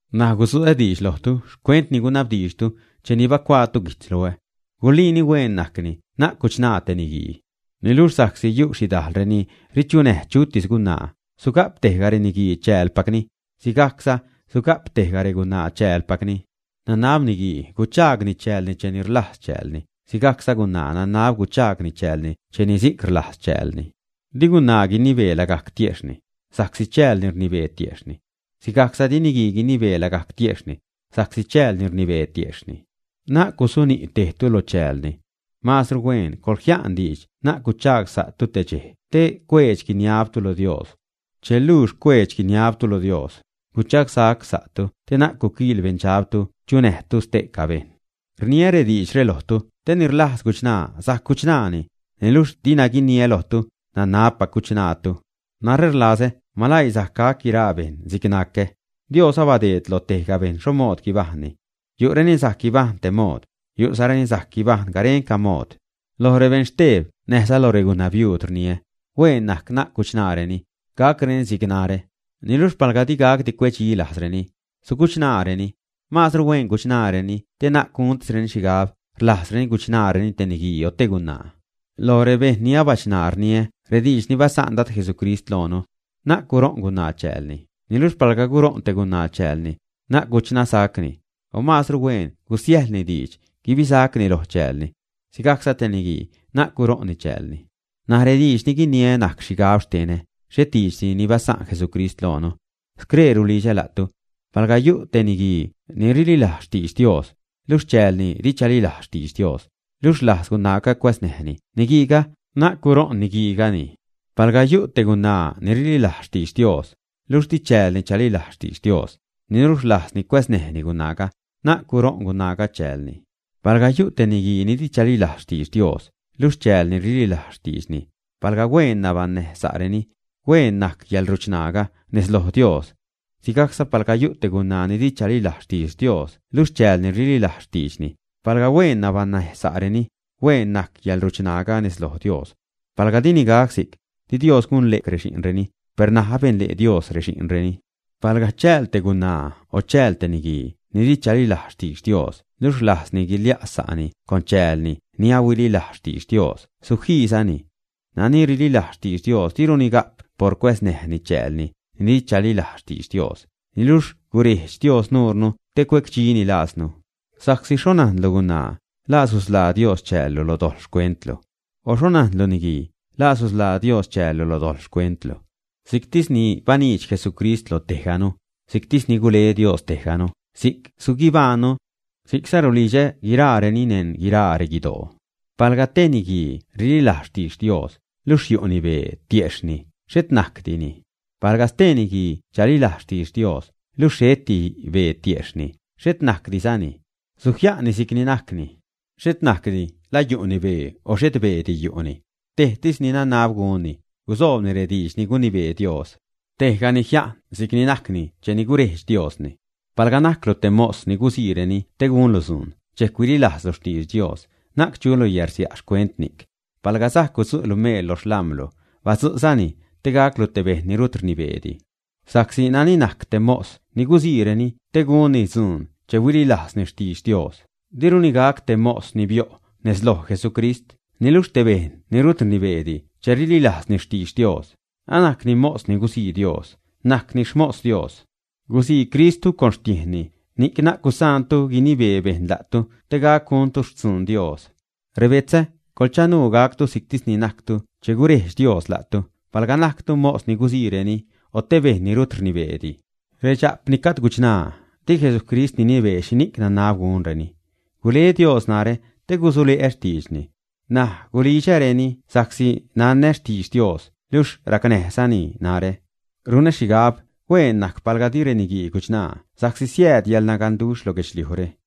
N̲aj gudzu'ä diidx lojtu xcuent ni gunabdiidxtu cheni bacuaatu guijtz loä. Guliini hueen najcni na'c guchṉaa te niguii. Niluxh sa'csi yu' xhidajl reni richunäj chutis gunaa, suga'p tejga reniguii chäälpacni; sigajcza suga'p tejga regunaa chäälpacni. Nanab niguii guchaagni chäälni che rlajz chäälni, sigajcza gunaa nanab guchaagni chäälni che ni si'c rlajz chäälni. Di gunaa guinibee lagajc tiejxhni, sa'csi chäälni rnibee tiejxhni. Sigajcza di niguii guinibee lagajc tiejxhni, sa'csi chäälni rnibee tiejxhni. Na'c gusuni' tejtu lo chäälni. Maazru hueen coḻjia'n diidx na'c guchagsa'tu te xcheje' te cuedx-guiniabtu lo Dios. Che luux cuedx-guiniabtu lo Dios, guchagsacsa'tu te na'c guquiḻ beṉdxabtu chunäjtu ste'ca bejṉ. Rniä rediidxre lojtu te ni rlajz guchṉaa sajc guchṉaani, niluxh dina guiniä lojtu, nanabpac guchṉaatu. Narä rlazä maläii sajc gac guiraa bejṉ si'c ni nacä. Dios abadeed loj tejga bejṉ xho mood guibajṉni. Yu'reni sajc guibajṉ tej mood, yu'zareni sajc guibajṉ garenca mood. Loj rebeṉ xteb näjza loj regunabiuud rniä, hueen najc na'c guchṉaareni, gacreni si'c narä. Niluxh palga di gacdi cue'cdxi lajzreni, suguchṉaareni. Maazru huen guchṉaareni te na'c guntisreni xhigab rlajzreni guchaagreni te niguii o te gunaa. Loj rebejṉ ni abachṉaa, rniä rediidx ni basa'n Dad Jesucrist loonu: “Na'c guṟo'n gunaa chäälni.” Niluxh palga guṟo'n te gunaa chäälni, na'c guchṉasacni, o maazru hueen gusiäjḻni diidx guibisacni lo chäälni. Sigajcza te niguii na'c guṟo'nni chäälni. N̲aj rediidx ni guiniä najc xhigab xtenä, xhet diidxdi ni basa'n Jesucrist loonu. Scree rulidxä la'tu. Palga yu' te niguii ni rililajz xtidx Dios, luxh chäälni di chalilajz xtidx Dios, luxh rlajz gunaaga cuäznäjni niguiiga, na'c guṟo'n niguiigani. Palga yu' te gunaa ni rililajz xtidx Dios, luxh di chäälni chalilajz xtidx Dios, niluxh rlajzni cuäznäjni gunaaga, na'c guṟo'n gunaaga chäälni. Palga yu' te niguii ni di chalilajz xtidx Dios, luxh chäälni rililajz xtiidxni, palga hueen nabaṉnäj sa'reni, hueen najc yäḻruchṉaaga nez loj Dios. Sigajcza palga yu' te gunaa ni di chalilajz xtidx Dios luxh chäälni rililajz xtiidxni, palga hueen nabaṉnäjsa'reni, hueen najc yäḻruchṉaaga nez loj Dios. Palga dini gac si'c, di Dios gunle' rexi'nreni, per ṉaj abenle' Dios rexi'nreni. Palga chääl te gunaa o chääl te niguii ni di chalilajz xtidx Dios luxh rlajzni guilia' sa'ni con chäälni ni ahuililajz xtidx Dios, sujiizani. Nani rililajz xtidx Dios diruni ga'p por cuäznäjni chäälni ni di chalilajz xtidx Dios, niluxh gurejdx Dios nuurnu te cuecdxini lajznu. Sa'csi ¿xho najnlu, gunaa, la susḻaa Dios chäällu lo dojḻ xcuentlu, ä? O ¿xho najnlu, niguii, la susḻaa Dios chäällu lo dojḻ xcuentlu, ä? Si'ctis ni baniidx Jesucrist lo tejganu, si'ctis ni gule Dios tejganu, si'c suguibajṉnu. Si'cza rulidxä gunrenini neṉ guiraa reguidoo. Palga tej niguii rililajz xtidx Dios, luxh yu'ni bee tiejxhni, xhet najcdini. Palga stee niguii chalilajz xtidx Dios, luxh xheti bee tiejxhni, xhet najcdizani. Sujia'nni si'cni najcni. Xhet najcdi la yu'ni bee o xhet beedi yu'ni. Tejtis ni nanab gunni, gusoobni rediidx ni gunibee Dios. Tejgani jia'n si'cni najcni cheni gurejdx Diosni. Palga najclu te mos ni guziireni te gunlu dzuun, dxejc huililajzlu xtidx Dios, na'c chulu yärsia' xcuent ni'c. Palga sajc gudzu'lu meel lo xlam̲lu, badzu'zani te gaclu te bejṉ ni rut rnibeedi. Sa'csi nani najc te mos ni guziireni te gunni dzuun che huililajzni xtidx Dios, diruni gac te mos ni bio' nez loj Jesucrist, niluxh te bejṉ ni rut rnibeedi che rililajzni xtidx Dios, anajcni mos ni guzii Dios, najcni xmos Dios. Guzii Cristtu con xtiejnni, ni'c na'c gusaantu guinibee bejṉ la'tu te gac guntu xtzun Dios. Rebetzä, coḻchanuu gactu si'ctis ni najctu che gurejdx Dios la'tu, palga najctu mos ni guziireni, o te bejṉ ni rut rnibeedi. Redxa'p ni gajd guchṉaa, di Jesucrist ninibee xhini'c nanab gunreni. Gule Dios narä te gusule'ä xtiidxni. N̲aj gulidxäreni sa'csi nanä xtidx Dios, luxh racnäjzani narä. Runä xhigab hueen najc palga di reniguii guchṉaa sa'csi siääd yäḻnaganduxh lo guedxliujre.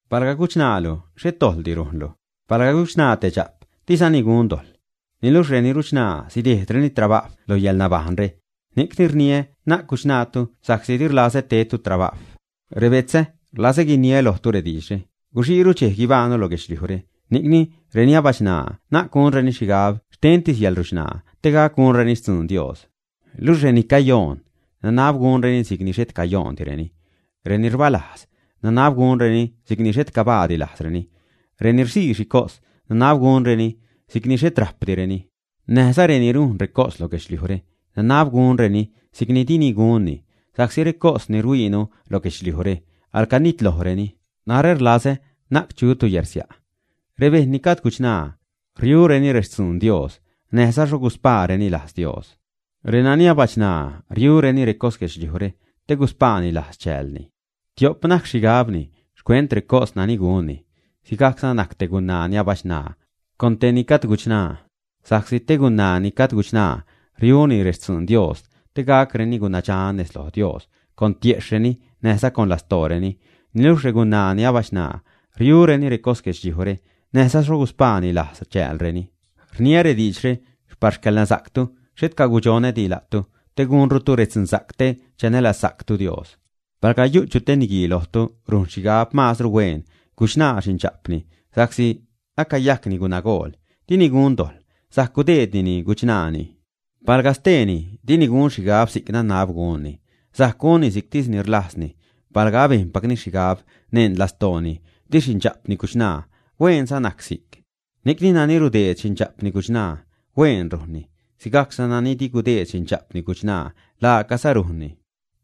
Palga guchṉaalu, xhet dojḻdi rujnlu. Palga guchṉaa te dxa'p, dizani gun dojḻ. Niluxh reni ruchṉaa sidejdreni trabajw lo yäḻnabajṉre. Ni'cni rniä na'c guchṉaatu sa'csi di rlazä tedtu trabajw. Rebetzä, rlazä guiniä lojtu rediidxre: Guxiiru dxej guibajṉnu lo guedxliujre, ni'cni reni abachṉaa na'c gunreni xhigab xtentis yäḻruchṉaa, te gac gunreni xtzuun Dios. Luxh reni cayoon, nanab gunreni si'cni xhet cayoondireni; reni rbalajzreni, nanab gunreni si'cni xhet cabaadi lajzreni; reni rzii xhicos, nanab gunreni si'cni xhet rajpdireni; näjza reni rujn recos lo guedxliujre, nanab gunreni si'cni dini gunni, sa'csi recos ni rhuiinu lo guedxliujre, alacanitlojreni. Narä rlazä na'c chutu yärsia'. Rebejṉ ni gajd guchṉaa, riureni rextzuun Dios, näjza xho guspaareni lajz Dios. Renani abachṉaa riureni recos guedxliujre te guspaani lajz chäälni, tiop najc xhigabni xcuent recos nani gunni. Sigajcza najc te gunaa ni abachṉaa con tejni gajd guchṉaa. Sa'csi te gunaa ni gajd guchṉaa riuni rextzuun Dios te gacreni gunadxan nez loj Dios con tiejxhreni näjza con lastooreni. Niluxh regunaa ni abachṉaa riureni recos guedxliujre, näjza xho guspaani lajz chäälreni. Rniä rediidxre par xcäḻnasa'ctu, xhet gudxonädi la'tu, te gunrutu redzunsa'c, te chanälazsa'ctu Dios. Palga yu' chu te niguii lojtu ni rujn xhigab, maazru hueen guchṉaa xindxa'pni sa'csi acayajcni gunagool, dini gun dojḻ, sajc gudeednini guchṉaani. Palga steeni dini gun xhigab si'c nanab gunni, sajc gunni si'ctis ni rlajzni palga abejnpacni xhigab neṉ lastooni di xindxa'pni guchṉaa, hueenza najc si'c. Ni'cni nani rudeed xinda'pni guchṉaa, hueen rujnni, sigajcza nani dini gudeed xindxa'pni guchṉaa, laacaza rujnni.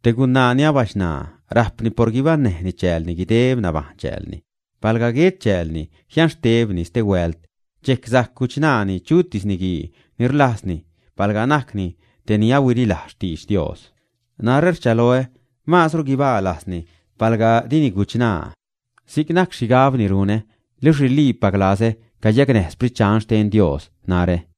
Te gunaa ni abachṉaa, rajpni por guibaṉnäjni chäälni guideb nabajṉ chäälni. Palga guet chäälni, jianxtebni stehuält, dxejc sajc guchṉaani chutis niguii ni rlajzni, palga najcni tej ni ahuililajz xtidx Dios. Narä rchaloä maazru guibaa lajzni palga dini guchṉaa. Si'c najc xhigab ni runä, luxh riliipac lazä cayacnäj Sprit Dxan xten Dios narä.